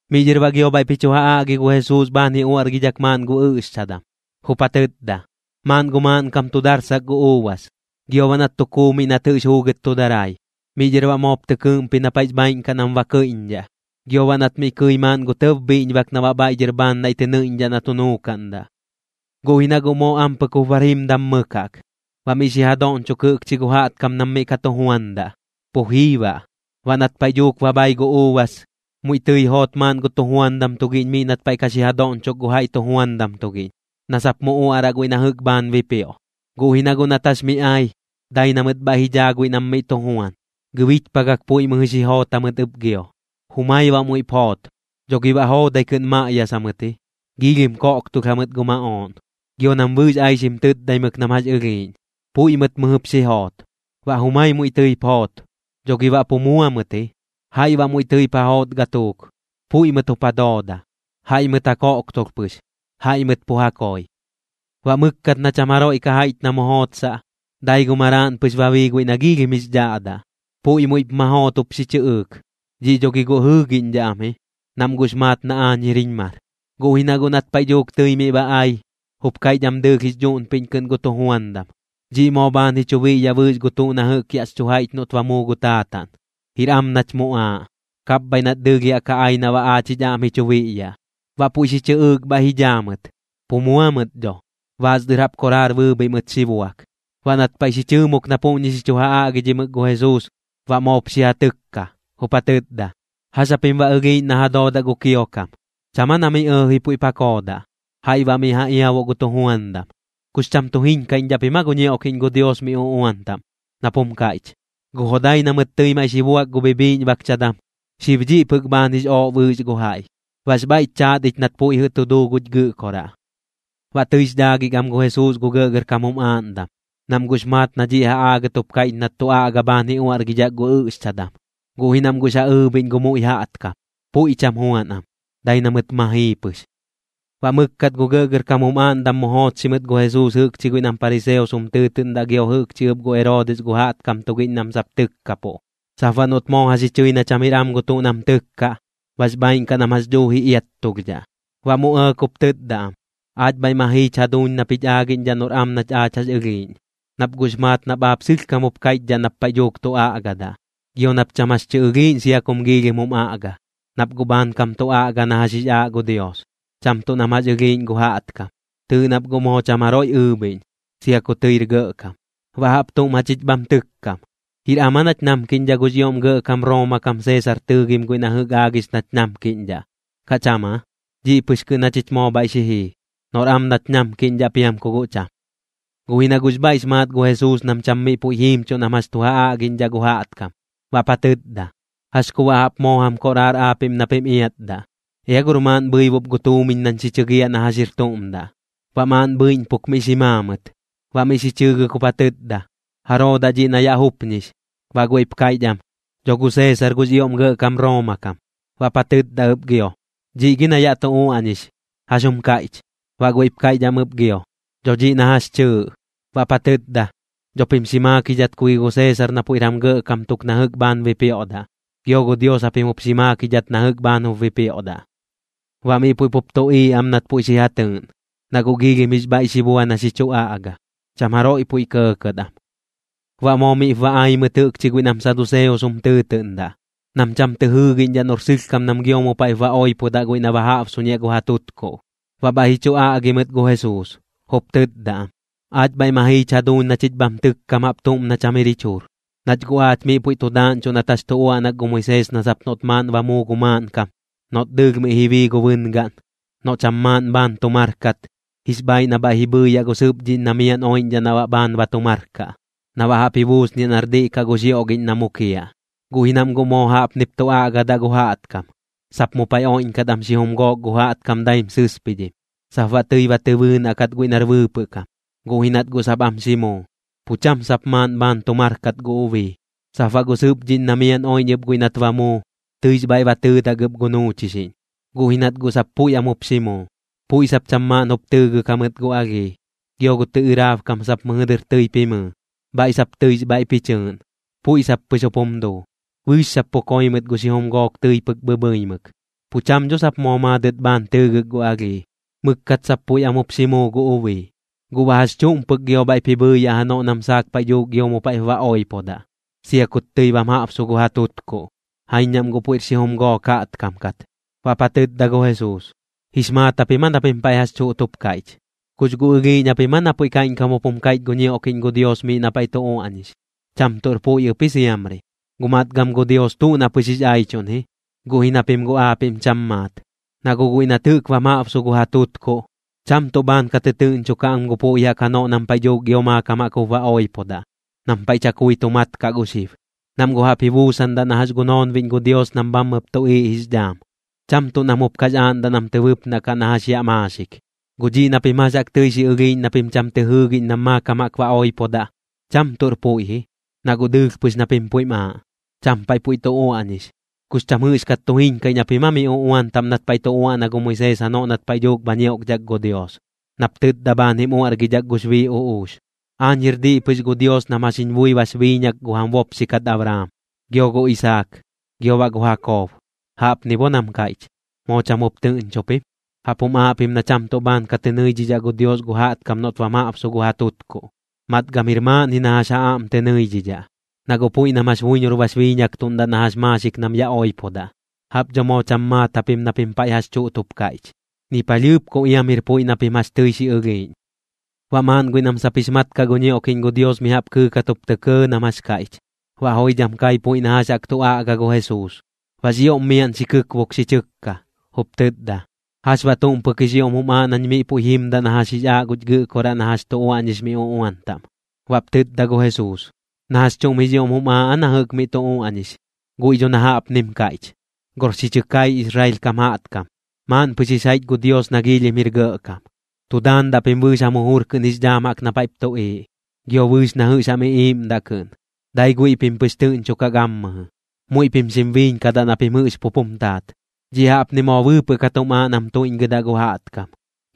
Miꞌ dhɨr baꞌ gio bhaiꞌp ji chu ja aꞌgi gu Jesuus bhaan ji uaꞌrgidhak maaꞌn gu ɨꞌxchadam, jup ja tɨtda: ―Maaꞌn gu maaꞌnkam tu darsak gu uubas, gio baꞌ nat tu kuu miꞌ nat jɨꞌx juugɨt tu darai. Miꞌ dhɨr baꞌ moop tɨ kɨɨꞌmpi na paiꞌx bhaaiꞌn kaꞌ nam ba kɨiꞌñdhaꞌ, gio baꞌ nat mi kɨi maaꞌn gu tɇb bhiꞌñbak na baꞌ bhaiꞌ dhɨr bhaan naiꞌ tɨ nɨiꞌñdhaꞌ na tu nuukaꞌndaꞌ. Guꞌ ji na guꞌ moo ampɨk jup bar jimdam mɨk jaꞌk, baꞌ miꞌ xi ja doꞌñchok jɨꞌkchi gu jaꞌtkam nam miꞌ ka tu juandaꞌ, pu jii baꞌ. ’Baꞌ nat paiꞌ dhuuk ba bhai gu uubas, muiꞌ tɨi joot maaꞌn gu tujuandam tugiꞌñ miꞌ nat paiꞌ ka xi ja doꞌñchok gu jaiꞌ tujuandam tugiꞌñ, na sap mu uaꞌraꞌ guiꞌ na jɨꞌk bhaan bipioꞌ. Guꞌ ji na guꞌ nat jax miꞌ ai, dai na mɨt bhaiꞌ ji dhaa guiꞌ nam miꞌ tu juan, gɨbichpagak puiꞌ mɨjɨ xi joot jamɨt ɨp gio. Jumai baꞌ muiꞌp joot. Dho gi baꞌ joodai kɨꞌn maꞌyasa mɨt ji, giilhim koꞌktolh jamɨt gu maꞌooꞌn, gio nam bɨɨx aixim tɨtdaimɨk nam jax ɨlhiiꞌñ, puiꞌ mɨt mɨjɨp xi joot. Baꞌ jumai muiꞌ tɨip joot. Dho gi baꞌ pu mua mɨt ji. Jaiꞌ baꞌ muiꞌ tɨip ja joot gatuuk. Puiꞌ mɨt jup ja dooda, jaiꞌ mɨt ja koꞌktolh pɨx, jaiꞌ mɨt pu ja koi. ’Baꞌ mɨkkat na cham jaroiꞌ ka jaiꞌch na mu jootsaꞌ, dai gu maraaꞌn pɨx ba bii guiꞌ nax ioꞌm jix dhaꞌdaꞌ, puiꞌ muiꞌp ma joot jup xi chɨꞌɨɨk: “Dhiꞌ dho gi guꞌ jɨɨꞌñdhaꞌ am ji, nam guꞌx maat na aañ jir jiñ mar.” Guꞌ ji na guꞌ nat paiꞌ dhuuk tɨi miꞌ ba ai, jup kaiꞌch am dɨɨlh jix dhuꞌnpiꞌñ kɨꞌn gu tujuandam: “Dhiꞌ moo bhaan ji chu biꞌyaꞌ bɨɨx gu tuꞌ na jɨꞌk yaꞌx chu jaiꞌch noꞌt ba muu gu taataꞌn. Jir am nach muꞌaaꞌ, kapbhaiꞌ nat dɨɨlh yaꞌ ka ai na baꞌ aach jich aꞌm ji chu biꞌyaꞌ.” Baꞌ puiꞌ xi chɨꞌɨɨk bhaiꞌ ji dhaa mɨt, pu mua mɨt dho, baas dɨr jaꞌp koraar bɨɨbhiꞌ mɨt xi buak. Baꞌ nat paiꞌ xi chɨɨmuk na puꞌñi xi chu ja aꞌgidhimɨk gu Jesuus, baꞌ moop xi ja tɨkka, jup ja tɨtda: ―¿Jax japim baꞌ ɨlhiiꞌñ na ja doodaꞌ gu kiokam? ¿Cham aa na miꞌ ɇɇji puiꞌp ja koodaꞌ, jaiꞌ baꞌ mi ja iabuꞌ gu tujuandam? ¿Kux cham tu jiñkaiꞌñdhaꞌ pim aa gu ñioꞌkiꞌñ gu Dios mi uꞌuan taꞌm? Nap jum kaiꞌch: Gu jodai na mɨt tɨi maiꞌ xi buak gu bhibhiꞌñbakchadam, xib dhiꞌ pɨk bhaan jix ooꞌ bɨɨx gu jaiꞌ. Baꞌx bhaiꞌch chaat ich nat puiꞌ jɨꞌ tu duu guch Gɨꞌkoraꞌ. Baꞌ tɨix dhaagik am gu Jesuus gu gɇꞌgɇrkam jum aaꞌndam, nam guꞌx maat na dhiꞌ ja aagɨt jup kaiꞌch nat tu aꞌga bhaan ji uaꞌrgidhak gu ɨꞌxchadam. Guꞌ ji nam guꞌx ja ɨɨbhiꞌñ gu muiꞌ jaꞌtkam, puiꞌ cham juan am, dai na mɨt ma jii pɨx. Baꞌ mɨkkat gu gɇꞌgɇrkam jum aaꞌndam mu joochxi mɨt gu Jesuus jɨꞌkchi guiꞌ nam pariseos jum tɨɨtɨꞌndaꞌ gio jɨꞌkchi ɨp gu Eroodis gu jaꞌtkam tugiꞌñ nam sap tɨkkapuꞌ, sap baꞌ noꞌt moo jax ji chɨi na cham jir am gu tuꞌ nam tɨkkaꞌ, bax bhaaiꞌn kaꞌ nam jax dhuuji iattulhdhaꞌ. Baꞌ mu ɇɇk jup tɨtda am: ―Aach bhaiꞌ ma jiich jaduuñ nap jich aagiꞌñdhaꞌ noꞌr am nach aach jax ɨlhiiꞌñ, nach guꞌx maat nap aap sɨlhkam jup kaiꞌchdhaꞌ nap paiꞌ dhuuk tu aꞌgadaꞌ, gio nap cham jax tɨ ɨlhiiꞌñ sia kum giilhim jum aꞌga, nap guꞌ bhaankam tu aꞌga na jax jix aaꞌ gu Dios, cham tuꞌ nam jax jaꞌk ɨlhiiꞌñ gu jaꞌtkam. Tɨɨꞌ nap guꞌ moo cham jaroiꞌ ɨɨbhiꞌñ, sia ku tɨir gɇꞌkam. Baꞌ jaꞌp tuꞌm jachich bham tɨkkam: ¿Jir am aa nach namkiꞌñdhaꞌ gux ioꞌm gɇꞌkam Rooma kam Seesar tɨɨgim guiꞌ na jɨꞌk aagix nach tu namkiꞌñdhaꞌ, kaꞌ cham aa? Dhiꞌ pɨx kɨꞌn jachich moo bhaiꞌ xi jii, noꞌr am nach namkiꞌñdhaꞌ piam ku guꞌ cham. Guꞌ ji na guꞌx bhaiꞌx maat gu Jesuus nam cham miꞌ puiꞌ jiimchuꞌ nam jax tu ja aꞌgiꞌñdhaꞌ gu jaꞌtkam. Baꞌp ja tɨtda: ―¿Jax ku baꞌ jaꞌp moo jam koꞌraar aapiꞌm na pim iatdaꞌ? Ea gor maaꞌn bhɨibup gu tuumiñ nañ xi chɨgiaꞌ na jax jir tuꞌm daꞌ. Baꞌ maaꞌn bhɨiꞌñpuk miꞌ xi maa mɨt. Baꞌ miꞌ xi chɨɨgɨk jup ja tɨtda: ―¿Jaroo daꞌ dhiꞌ na yaꞌ jupñix? Baꞌ guiꞌp kaiꞌch am: ―Dho gu Seesar gux ioꞌm gɇꞌkam Rooma kam. Baꞌp ja tɨtda ɨp gio: ―Dhiꞌ gi na yaꞌ tu uaꞌñix, ¿jax jum kaiꞌch? Baꞌ guiꞌp kaiꞌch am ɨp gio: ―Dho dhiꞌ na jax chɨɨꞌ. Baꞌp ja tɨtda: ―Dho pim xi maakidhat ku gi gu Seesar na puiꞌr jam gɇꞌkam tuk na jɨꞌk bhaan bipioꞌdaꞌ, gio gu Dios japim jup xi maakidhat na jɨꞌk bhaan jup bipioꞌdaꞌ. Baꞌ miꞌ puiꞌ pup tuꞌiiꞌ am nat puiꞌ jɨꞌ xi ja tɨɨꞌn, na guꞌ joidham jix bhaiꞌ xi bua na xi chu aꞌga. Cham jaroiꞌ puiꞌ kɇɇkɇt am. Baꞌ moo miꞌp ba ai mɨt jɨꞌkchi guiꞌ nam saduseos jum tɨɨtɨꞌndaꞌ, nam cham tɨ jɨɨgiꞌñdhaꞌ noꞌr sɨlhkam nam gio mu paiꞌp ba oipodaꞌ guiꞌ na ba jaꞌbsuñiaꞌ gu ja tutkuꞌ. Baꞌ bhaiꞌ ji chu aꞌgi mɨt gu Jesuus, jup tɨtda am: ―Aach bhaiꞌ ma jiich jaduuñ na chich bham tɨkkam jaꞌp tuꞌm na cham jir jich jujur. Nach guꞌ aach miꞌ puiꞌ tu daaꞌñchuꞌ nat jax tu uaꞌnak gu Moisees na sap noꞌt maaꞌn ba muu gu maaꞌnkam, noꞌt dɨɨlh miꞌ ji bii gu bɨngaꞌn, noꞌ cham maaꞌn bhaan tu mar kat, jix bhaiꞌ na bhaiꞌ ji bhɨɨyaꞌ gu sɨpdhiꞌñ na miaꞌn oiꞌñdhaꞌ na baꞌ bhaan ba tu mar kaꞌ, na baꞌ jaꞌp ji buusniaꞌ nar diꞌ kaꞌ gu xioꞌgiꞌñ na mukiaꞌ. Guꞌ ji nam guꞌ moo jaꞌpnip tu aꞌgadaꞌ gu jaꞌtkam, sap mu paiꞌ oiꞌñkat am xijum gook gu jaꞌtkam daim sɨspidhim. Sap baꞌ tɨi ba tɨ bɨɨnaꞌ kat guiꞌ nar bɨɨpɨꞌ kam, guꞌ ji nat guꞌ sap am xi muu, pu cham sap maaꞌn bhaan tu mar kat gu ubii. Sap baꞌ gu sɨpdhiꞌñ na miaꞌn oiꞌñ ɨp guiꞌ nat ba muu, tɨix bhaiꞌ ba tɨɨdak ɨp gu nuuchixiꞌñ, guꞌ ji nat guꞌ sap puiꞌ am jup xi muu, puiꞌ sap cham maaꞌn jup tɨɨgɨk jamɨt gu alhii. Gio gu tɨꞌɨrab kam sap mɨjɨ dɨr tɨip jimɨɨ, bhaiꞌ sap tɨix bhaiꞌp ji chɨɨꞌn, puiꞌ sap pɨx jup jum duu. Bɨɨx sap pu koi mɨt gu xijum gook tɨi pɨk bhɨbhɨimɨk, pu cham dho sap moo maadɨt bhaan tɨɨgɨk gu alhii. Mɨkkat sap puiꞌ am jup xi muu gu ubii. ¿Guꞌ baꞌ jax chuꞌm pɨk gio bhaiꞌp ji bhɨɨyaꞌ janoꞌ nam saak paiꞌ dhuuk gio mu paiꞌp ba oipodaꞌ, sia kut tɨi bam jaꞌbsu gu ja tutkuꞌ? Jaiñ nam guꞌ puiꞌr xijum gook jaꞌtkam kat. Baꞌp ja tɨtda gu Jesuus: ―¿Jix maat japim aa na pim paiꞌ jax chuꞌt jup kaiꞌch? ¿Kux guꞌ ɨlhiiꞌñ japim aa na puiꞌ kaiꞌñkam jup jum kaiꞌch gu ñioꞌkiꞌñ gu Dios miꞌ na paiꞌ tu uaꞌñix? Cham tuꞌr puiꞌ ɨp ji siamri. Guꞌ matgam gu Dios tuꞌ na pɨx jix aichuꞌn ji, guꞌ ji na pim guꞌ aapiꞌm cham maat. Na guꞌ guiꞌ nat jɨꞌk bam jaꞌbsu gu ja tutkuꞌ, cham tuꞌ bhaan ka tɨtɨɨꞌñchukaꞌ am gu puiꞌ jaꞌk janoꞌ nam paiꞌ dhuuk gio maakam jaꞌk jup ba oipodaꞌ, nam paiꞌ chakui tu mat kaꞌ gu xib. Nam guꞌ jaꞌp ji buusandaꞌ na jax gu noonbiꞌñ gu Dios nam bhammɨp tuꞌiiꞌ jix dhaam, cham tuꞌ nam jup kax aaꞌndaꞌ nam tɨ bɨpnaꞌ kaꞌ na jax yaꞌ maaxik. Guꞌ dhiꞌ na pim jax jaꞌk tɨi xi ɨlhiiꞌñ na pim cham tɨ jɨɨgiꞌñ nam maakam jaꞌk ba oipodaꞌ, cham tuꞌr puiꞌ ji, na guꞌ dɨɨlh pɨx na pim puiꞌm aaꞌ, cham paiꞌ puiꞌ tu uaꞌñix. ¿Kux cham jɨꞌxkat tu jiñkaiꞌñ japim aa mi uꞌuan taꞌm nat paiꞌ tu uaꞌna gu Moisees janoꞌ nat paiꞌ dhuuk bha ñioꞌkdhak gu Dios? Nap tɨtda bhaan jim uaꞌrgidhak gux bii uꞌux: “Aañ jir diꞌ pɨx gu Dios nam jax jiñ bui bax biiñak gu jam bopxi kat Abraam, gio gu Isaak, gio baꞌ gu Jakob.” Jaꞌpni bo nam kaiꞌch, ¿moo cham jup tɨꞌñchu pim? Jaꞌp jum aaꞌ pim na cham tuꞌ bhaan ka tɨ nɨidhidhaꞌ gu Dios gu jaꞌtkam noꞌt bam jaꞌbsu gu ja tutkuꞌ. Matgam jir maaꞌn ji na jax ja aꞌm tɨ nɨidhidhaꞌ, na guꞌ puiꞌ nam jax buiñor bax biiñaktuꞌndaꞌ na jax maaxik nam yaꞌ oipodaꞌ. Jaꞌp dho moo cham maat japim na pim paiꞌ jax chuꞌt jup kaiꞌch, ni palhɨɨp ku iam jir puiꞌ na pim jax tɨi xi ɨlhiiꞌñ. Baꞌ maaꞌn guiꞌ na sap jix mat kaꞌ gu ñioꞌkiꞌñ gu Dios mi jaꞌp kɨɨkat jup tɇ kɇɇ nam jax kaiꞌch, baꞌ joidham kai puiꞌ na jax jaꞌk tu aꞌga gu Jesuus. Baꞌx ioꞌm miaꞌn xi kɨkbuk xi chɨkka, jup tɨtda: ―¿Jax baꞌ tuꞌm pɨk jix ioꞌm jum aaꞌ nañ miꞌ puiꞌ jimdaꞌ na jax jix aaꞌ guch Gɨꞌkoraꞌ na jax tu uaꞌñix mi uꞌuan taꞌm? Baꞌp tɨtda gu Jesuus: ―¿Na jax chuꞌm jix ioꞌm jum aaꞌ aa na jɨꞌk miꞌ tu uaꞌñix? Guiꞌ dho na jaꞌpnim kaiꞌch: “Gor xi chɨ kai Israel kam jaꞌtkam, maaꞌn pɨx jix jaiꞌch gu Dios nax ioꞌm jir gɇꞌkam. Tu daandaꞌ pim bɨɨx jam jujur kɨꞌn jix dhaam jaꞌk na paiꞌp tuꞌiiꞌ, gio bɨɨx na jɨꞌx jam iꞌiiꞌmdaꞌ kɨꞌn. Dai guiꞌ pim pɨx tɨꞌñchukaꞌ gammɨjɨ, muiꞌ pim xim biiñkadaꞌ na pim jɨꞌx pup jum taat.” Dhiꞌ jaꞌpni moo bɨɨpɨꞌ kat jum aaꞌ nam tuiꞌñgɨdaꞌ gu jaꞌtkam.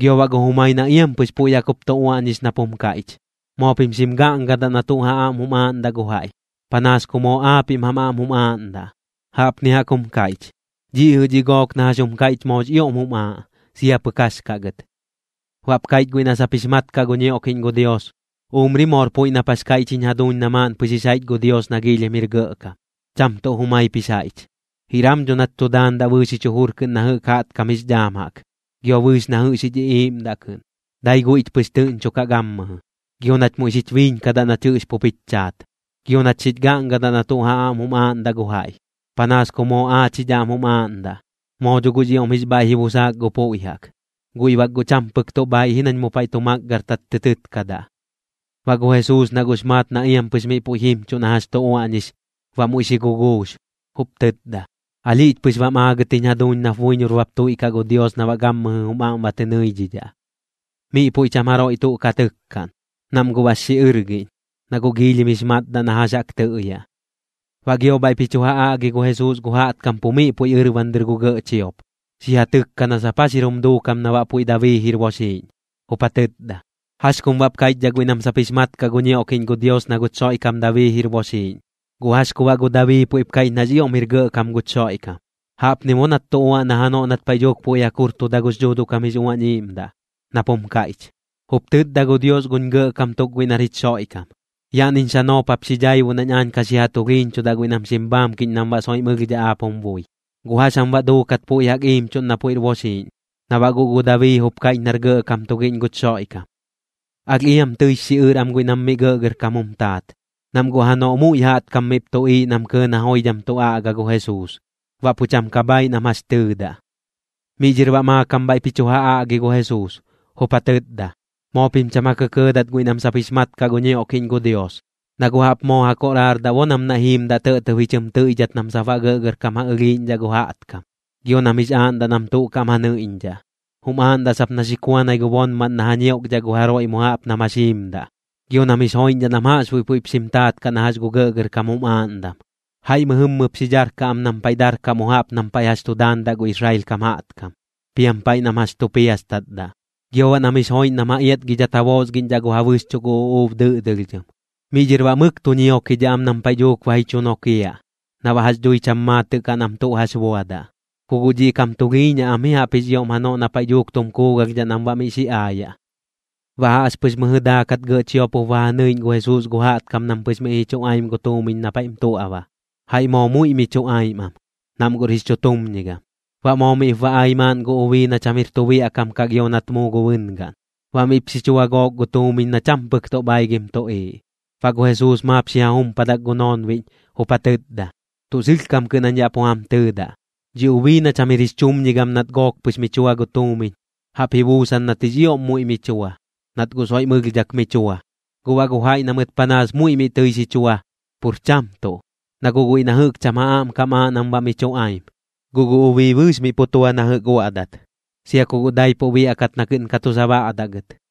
Gio baꞌ gu jumai na iampɨx puiꞌ jaꞌk jup tu uaꞌñix nap jum kaiꞌch: “Moo pim xim gaꞌngadaꞌ na tuꞌ ja aꞌm jum aaꞌndaꞌ gu jaiꞌ, panaas ku moo aapiꞌm jam aꞌm jum aaꞌndaꞌ.” Jaꞌpni jaꞌk jum kaiꞌch. Dhiꞌ jɨꞌ dhi gook na jax jum kaiꞌch moox ioꞌm jum aaꞌ, sia pɨk jax kaꞌ gɨt. Baꞌp kaiꞌch guiꞌ na sap jix mat kaꞌ gu ñioꞌkiꞌñ gu Dios: ―Umri moor puiꞌ nap jax kaiꞌch jiñ jaduuñ na maaꞌn pɨx jix jaiꞌch gu Dios nax ioꞌm jir gɇꞌkam, cham tuꞌ jumaip jix jaiꞌch. Jir am dho nach tu daandaꞌ bɨɨx jich jujur kɨꞌn na jɨꞌk jaꞌtkam jix dhaam jaꞌk, gio bɨɨx na jɨꞌx jich iꞌiiꞌmdaꞌ kɨꞌn. Dai guiꞌch pɨx tɨꞌñchukaꞌ gammɨjɨ, gio nach muiꞌ xich biiñkadaꞌ nach jɨꞌx pup jich chaat. Gio nach xich gaꞌngadaꞌ na tuꞌ ja aꞌm jum aaꞌndaꞌ gu jaiꞌ, panaas ku moo aach jich aꞌm jum aaꞌndaꞌ. Moo dho guꞌx ioꞌm jix bhaiꞌ ji busaak gu puiꞌ jaꞌk, guiꞌ bak guꞌ cham pɨk tuꞌ bhaiꞌ ji nañ mu paiꞌ tu makgɨrtat tɨ tɨkkadaꞌ. Baꞌ gu Jesuus na guꞌx maat na iampɨx miꞌ puiꞌ jimchuꞌ na jax tu uaꞌñix, baꞌ muiꞌ xi guguux, jup tɨtda: ―Alhiꞌch pɨx bam aagɨt jiñ jaduuñ nap buiñor bap tuiꞌkaꞌ gu Dios na baꞌ gammɨjɨ jum aꞌm ba tɨ nɨiꞌñdhaꞌ. Miꞌ puiꞌ cham jaroiꞌ tuꞌ ka tɨkkaꞌn, nam guꞌ bax xiꞌɨrgiꞌñ, na guꞌx ioꞌm jix matdaꞌ na jax jaꞌk tɨꞌyaꞌ. Baꞌ gio bhaiꞌp ji chu ja aꞌgi gu Jesuus gu jaꞌtkam pu miꞌ puiꞌ ɨrban dɨr gu gɇꞌ chiop, xi ja tɨkkaꞌn na sap jax jir jum duukam na baꞌ puiꞌ Dabii jir boxiꞌñ. Jup ja tɨtda: ―¿Jax kum baꞌp kaiꞌchdhaꞌ guiꞌ nam sap jix mat kaꞌ gu ñioꞌkiꞌñ gu Dios na guch Xoiꞌkam Dabii jir boxiꞌñ? ¿Guꞌ jax ku baꞌ gu Dabii puiꞌp kaiꞌch nax ioꞌm jir gɇꞌkam guch Xoiꞌkam? Jaꞌpni bo nat tu uaꞌna janoꞌ nat paiꞌ dhuuk puiꞌ jaꞌk jurtuda gux Dhuuduꞌ kam jix Uañ Iiꞌmdaꞌ, nap jum kaiꞌch: Jup tɨtda gu Dios guñ Gɇꞌkam tuk guiꞌ nar jich Xoiꞌkam: “Yaꞌniñ xanoop jap xi dhaibuꞌ nañ aañ ka xi ja tulhiiñchudaꞌ guiꞌ nam xim bhaamkiꞌñ nam baꞌ soiꞌm ɨlhdhaꞌ aap jum bui.” ¿Guꞌ jax jam baꞌ duukat puiꞌ jaꞌk iimchuꞌn na puiꞌr boxiiꞌñ, na baꞌ guꞌ gu Dabii jup kaiꞌch nar Gɇꞌkam tugiꞌñ guch Xoiꞌkam? Alh iam tɨix xiꞌɨr am guiꞌ nam miꞌ gɇꞌgɇrkam jum taat, nam guꞌ janoꞌ muiꞌ jaꞌtkam miꞌp tuꞌiiꞌ nam kɇɇ na joidham tu aꞌga gu Jesuus. Baꞌ pu cham ka bhaaiꞌ nam jax tɨɨdaꞌ. Miꞌ dhɨr baꞌ maakam bhaiꞌp ji chu ja aꞌgi gu Jesuus, jup ja tɨtda: ―Moo pim cham ja kɇkɇɇdat guiꞌ nam sap jix mat kaꞌ gu ñioꞌkiꞌñ gu Dios, na guꞌ jaꞌp moo ja koꞌraardaꞌ bo nam naiꞌ jiimdaꞌ tɇꞌtɇb ji chɨm tɨiꞌdhat nam sap baꞌ gɇꞌgɇrkam ja ɨlhiiꞌñdhaꞌ gu jaꞌtkam. Gio nam jix aaꞌndaꞌ nam tuꞌ kaꞌm ja nɨiꞌñdhaꞌ, jum aaꞌndaꞌ sap na xi kuanai gu bonmaꞌn na ja ñioꞌkdhaꞌ gu jaroiꞌ mu jaꞌp nam jax jiimdaꞌ. Gio nam jix joiꞌñdhaꞌ nam jaꞌxbuiꞌ puiꞌp xim taat kaꞌ na jax gu gɇꞌgɇrkam jum aaꞌndam. Jaiꞌ mɨjɨmmɨp xi dharkaꞌ am nam paiꞌ darkaꞌ mu jaꞌp nam paiꞌ jax tu daandaꞌ gu Israel kam jaꞌtkam, piam paiꞌ nam jax tu piastatdaꞌ. Gio baꞌ nam jix joiꞌñ nam ja iatgidhat ja boosgiꞌñdhaꞌ gu ja bɨxchuꞌ gu uꞌuub dɨꞌdɨlhdhɨm. Miꞌ dhɨr baꞌ mɨk tu ñiokidhaꞌ am nam paiꞌ dhuuk ba ji chu nokiaꞌ, na baꞌ jax dhui cham maatɨꞌ kaꞌ nam tuꞌ jax buadaꞌ. Ku guꞌ dhiꞌ kam tulhiiñaꞌ am ji jaꞌp jix ioꞌm janoꞌ na paiꞌ dhuuk tum kuugalhdhaꞌ nam baꞌ miꞌ xi aayaꞌ. Baꞌ jaꞌxpɨx mɨjɨ daakat gɇꞌ chiop jup ba ja nɨiꞌñ gu Jesuus gu jaꞌtkam nam pɨx miꞌ ji chuꞌaim gu tuumiñ na paiꞌm tuaꞌba. Jaiꞌ moo muiꞌ mi chuꞌaim am, nam guꞌr jix chutumñigam. Baꞌ moo miꞌp ba ai maaꞌn gu ubii na cham jir tu biaꞌkam kaꞌ gio nat muu gu bɨngaꞌn, baꞌ miꞌp xi chua gook gu tuumiñ na cham pɨk tuꞌ bhaigɨm tuꞌiiꞌ. Baꞌ gu Jesuus maap xi ja jumpadak gu noonbiꞌñ, jup ja tɨtda: ―Tuꞌ sɨlhkam kɨꞌn jañ yaꞌ pu jam tɨɨdaꞌ, dhi ubii na cham jir jix chumñigam nat gook pɨx mi chua gu tuumiñ, jaꞌp ji buusan nat jix ioꞌm muiꞌ mi chua, nat guꞌ soiꞌm ɨlhdhak mi chua. Guꞌ baꞌ gu jaiꞌ na mɨt panaas muiꞌ miꞌ tɨi xi chua, pur cham tuꞌ, na guꞌ guiꞌ na jɨꞌk cham ja aꞌm kam aaꞌ nam baꞌ mi chuꞌaim. Guꞌ gu ubii bɨɨx miꞌ pu tua na jɨꞌk uaꞌdat, sia ku guꞌ daipuꞌ biaꞌkat na kɨꞌn ka tu sabaꞌdaꞌ gɨt.